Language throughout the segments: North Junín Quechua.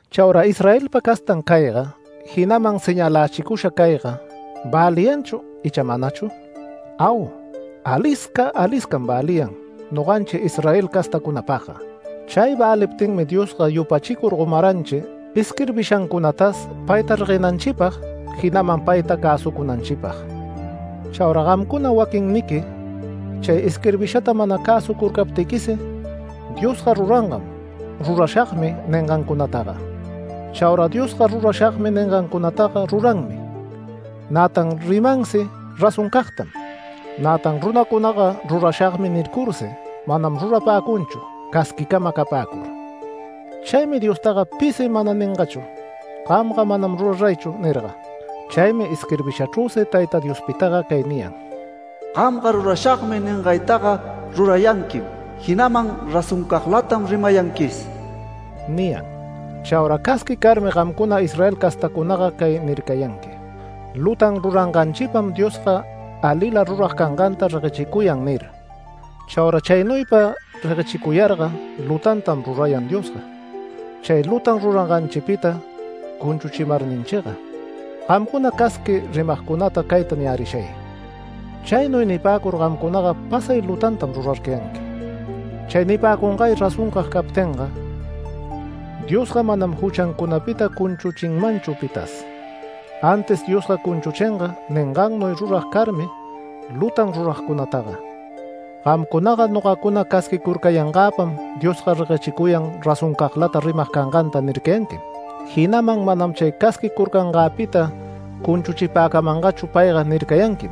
Chauraga Israelpa castan cayga, jinaman ¿señalächicusha cayga väliyanchu icha manachu? Au, alisca aliscam väliyan noganchi Israel castacunapagga. Chay väliptinmi Diosga yupachicur gomaranchi isquirbishancunatas payta reguenanchipag, jinaman payta cäsucunanchipag. Chauraga gamcuna waquinniqui chay isquirbishata mana cäsucurcaptiquisi Diosga rurangam “Rurashagmi” ningancunataga. Chaura Diosga “Rurashagmi” ningancunataga ruranmi, nätan rimansi razoncagtam. Nätan runacunaga “Rurashagmi” nircursi manam rurapäcunchu casquicama capäcur. Chaymi Diostaga pisi mana ningachu “Gamga manam ruraraychu” nirga. Chaymi isquirbishachrüsi Tayta Diostaga cay niyan: “Gamga ‘Rurashagmi’ ningaytaga rurayanquim jinaman razoncaglatam rimayanquis” niyan. Chaura casqui carmi gamcuna Israel castacunaga cay nircayanqui: “Lutan ruranganchipam Diosga alila rurag canganta reguechicuyan” nir. Chaura chaynuypa reguechicuyarga lutantam rurayan Diosga, chay lutan ruranganchipita cunchuchimarninchiga. Gamcuna casqui rimagcunata cayta niyärishay: Chaynuy nipäcur gamcunaga pasay lutantam rurarcayanqui. Chay nipäcungay razoncag captinga, Diosga manam juchancunapita cunchuchinmanchu pitas. Antis Diosga cunchuchinga ningannuy rurag carmi lutan ruragcunataga. Gamcunaga “Nogacuna casquicurcayangäpam Diosga reguechicuyan razoncaglata rimag canganta” nircayanquim. Jinaman “Manam chay casquicurcangäpita cunchuchipäcamangachu payga” nircayanquim.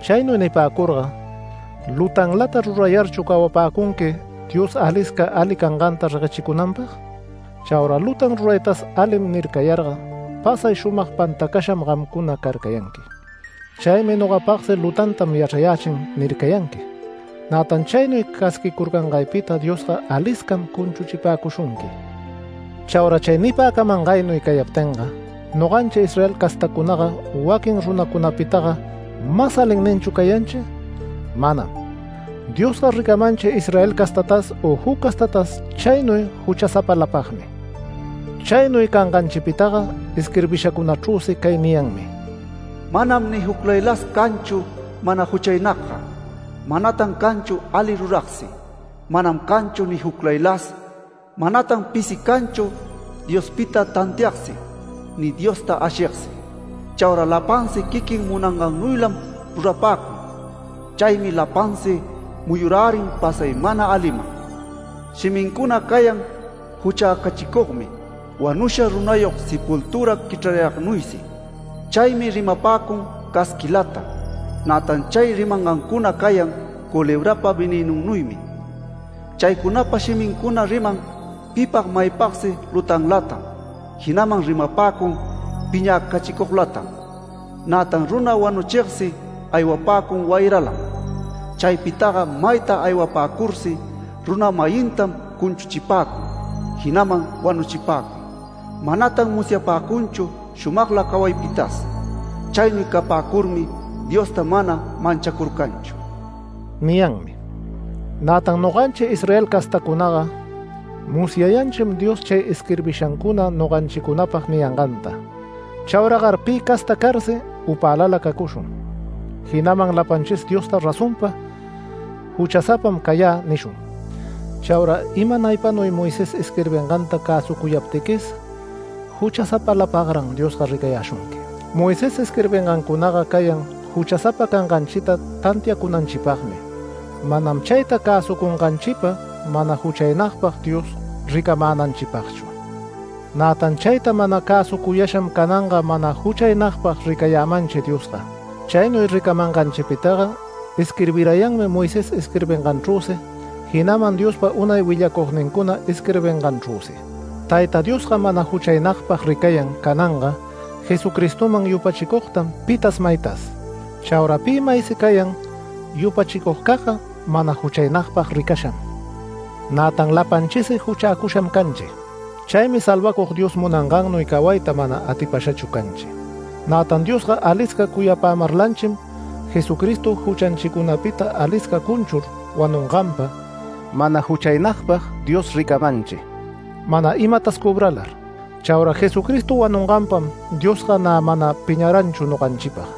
Chaynuy nipäcurga ¿lutanlata rurayarchu cawapäcunqui, Dios alisca ali canganta reguechicunanpag? Chaura lutan ruraytas “Alim” nircayarga pasay shumag pantacasham gamcuna carcayanqui. Chaymi nogapagsi “Lutantam yachrayächin” nircayanqui. Nätan chaynuy casquicurcangaypita Diosga aliscam cunchuchipäcushunqui. Chaura chay nipäcamangaynuy cayaptinga noganchi Israel castacunaga waquin runacunapitaga ¿mas alinninchu cayanchi? Manam. Diosga ricamanchi Israel castatas u juc castatas chaynuy juchasapalapagmi. Chaynuy canganchipitaga isquirbishacunachrüsi cay niyanmi: “Manam ni juclaylas canchu mana juchaynagga. Manatan canchu ali ruragsi, manam canchu ni juclaylas Manatan pisi canchu Diospita tantiagsi, ni Diosta ashigsi. Chaura lapansi quiquin munangannuylam rurapäcun. Chaymi lapansi muyurärin pasay mana aliman. Shimincuna cayan juchäcachicugmi wanusha runayog sepultüra quichrarayagnuysi. Chaymi rimapäcun casquilata. Nätan chay rimangancuna cayan culebrapa venënunnuymi. Chaycunapa shimincuna riman pipag maypagsi lutanlatam, jinaman rimapäcun piñäcachicuglatam. Nätan runa wanuchigsi aywapäcun wayralam. Chaypitaga mayta aywapäcursi runa-mayintam cunchuchipäcun, jinaman wanuchipäcun. Manatan musyapäcunchu shumagla cawaypitas. Chaynuy capäcurmi Diosta mana manchacurcanchu” niyanmi. Nätan noganchi Israel castacunaga musyayanchim Diospa chay isquirbishancuna noganchicunapag niyanganta. Chauragar pi casta carsi upälala cacushun, jinaman lapanchis Diosta razonpa “Juchasapam cayä” nishun. Chaura imanaypanuy Moisés isquirbinganta cäsucuyaptiquis juchasapalapagran Diosga ricayäshunqui. Moisés isquirbingancunaga cayan juchasapa canganchita tantiacunanchipagmi, manam chayta cäsucunganchipa mana juchaynagpag Dios ricamänanchipagchu. Nätan chayta mana cäsucuyasham cananga mana juchaynagpag ricayämanchi Diosga. Chaynuy ricamanganchipitaga isquirbirayanmi Moisés isquirbinganchrüsi, jinaman Diospa unay willacugnincuna isquirbinganchrüsi. Tayta Diosga mana juchaynagpag ricayan cananga Jesucristoman yupachicugtam pita maytas. Chaura pi maysi cayan yupachicugcagga mana juchaynagpag ricasham. Nätan lapanchisi juchäcusham canchi. Chaymi Salvacug Dios munangannuy cawayta mana atipashachu canchi. Nätan Diosga alisca cuyapämarlanchim Jesucristo juchanchicunapita alisca cunchur wanunganpa mana juchaynagpag Dios ricamanchi, mana imatas cobralar. Chaura Jesucristo wanunganpam Diosga nä mana piñaranchu noganchipag.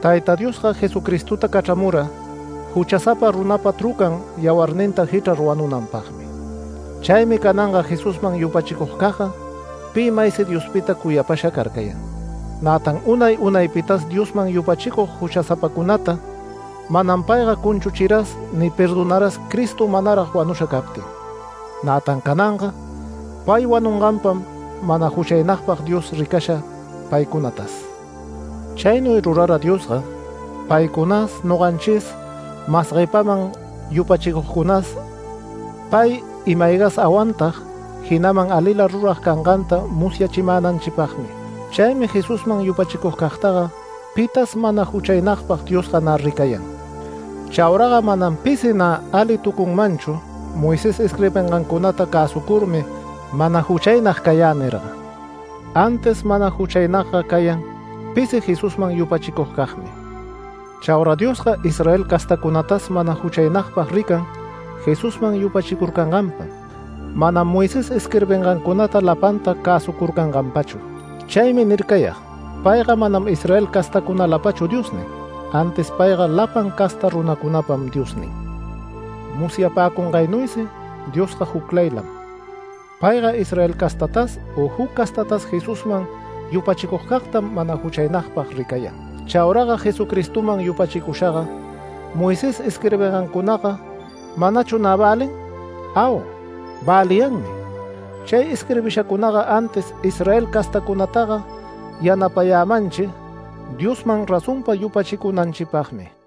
Tayta Diosga Jesucristota cachramura juchasapa runapa trucan yawarninta jichrar wanunanpagmi. Chaymi cananga Jesusman yupachicugcagga pi maysi Diospita cuyapasha carcayan. Nätan unay unaypitas Diosman yupachicug juchasapacunata, manam payga cunchuchiras ni perdonaras Cristo manarag wanusha captin. Nätan cananga pay wanunganpam mana juchaynagpag Dios ricasha paycunatas. Chaynuy rurara Diosga paycunas noganchis, mas guepaman yupachicugcunas pay ima-aygas awantag, jinaman alila rurag canganta musyachimänanchipagmi. Chaymi Jesusman yupachicugcagtaga pitas mana juchaynagpag Diosga nä ricayan. Chauraga manam pisi nä alitucunmanchu Moisés isquirbingancunata cäsucurmi “Mana juchaynag cayä” nirga. Antis mana juchaynagga cayan pisi Jesusman yupachicugcagmi. Chaura Diosga Israel castacunatas mana juchaynagpag rican Jesusman yupachicurcanganpam, manam Moisés isquirbingancunata lapanta cäsucurcanganpachu. Chaymi nircayag payga manam Israel castacunalapachu Diosnin, antis payga lapan casta runacunapam Diosnin. Musyapäcungaynuysi Diosga juclaylam. Payga Israel castatas u juc castatas Jesusman yupachicugcagtam mana juchaynagpag ricayan. Chauraga Jesucristoman yupachicushaga Moisés isquirbingancunaga ¿manachu nä välin? Au, väliyanmi. Chay isquirbishacunaga antis Israel castäcunataga yanapayämanchi Diosman razonpa yupachicunanchipagmi.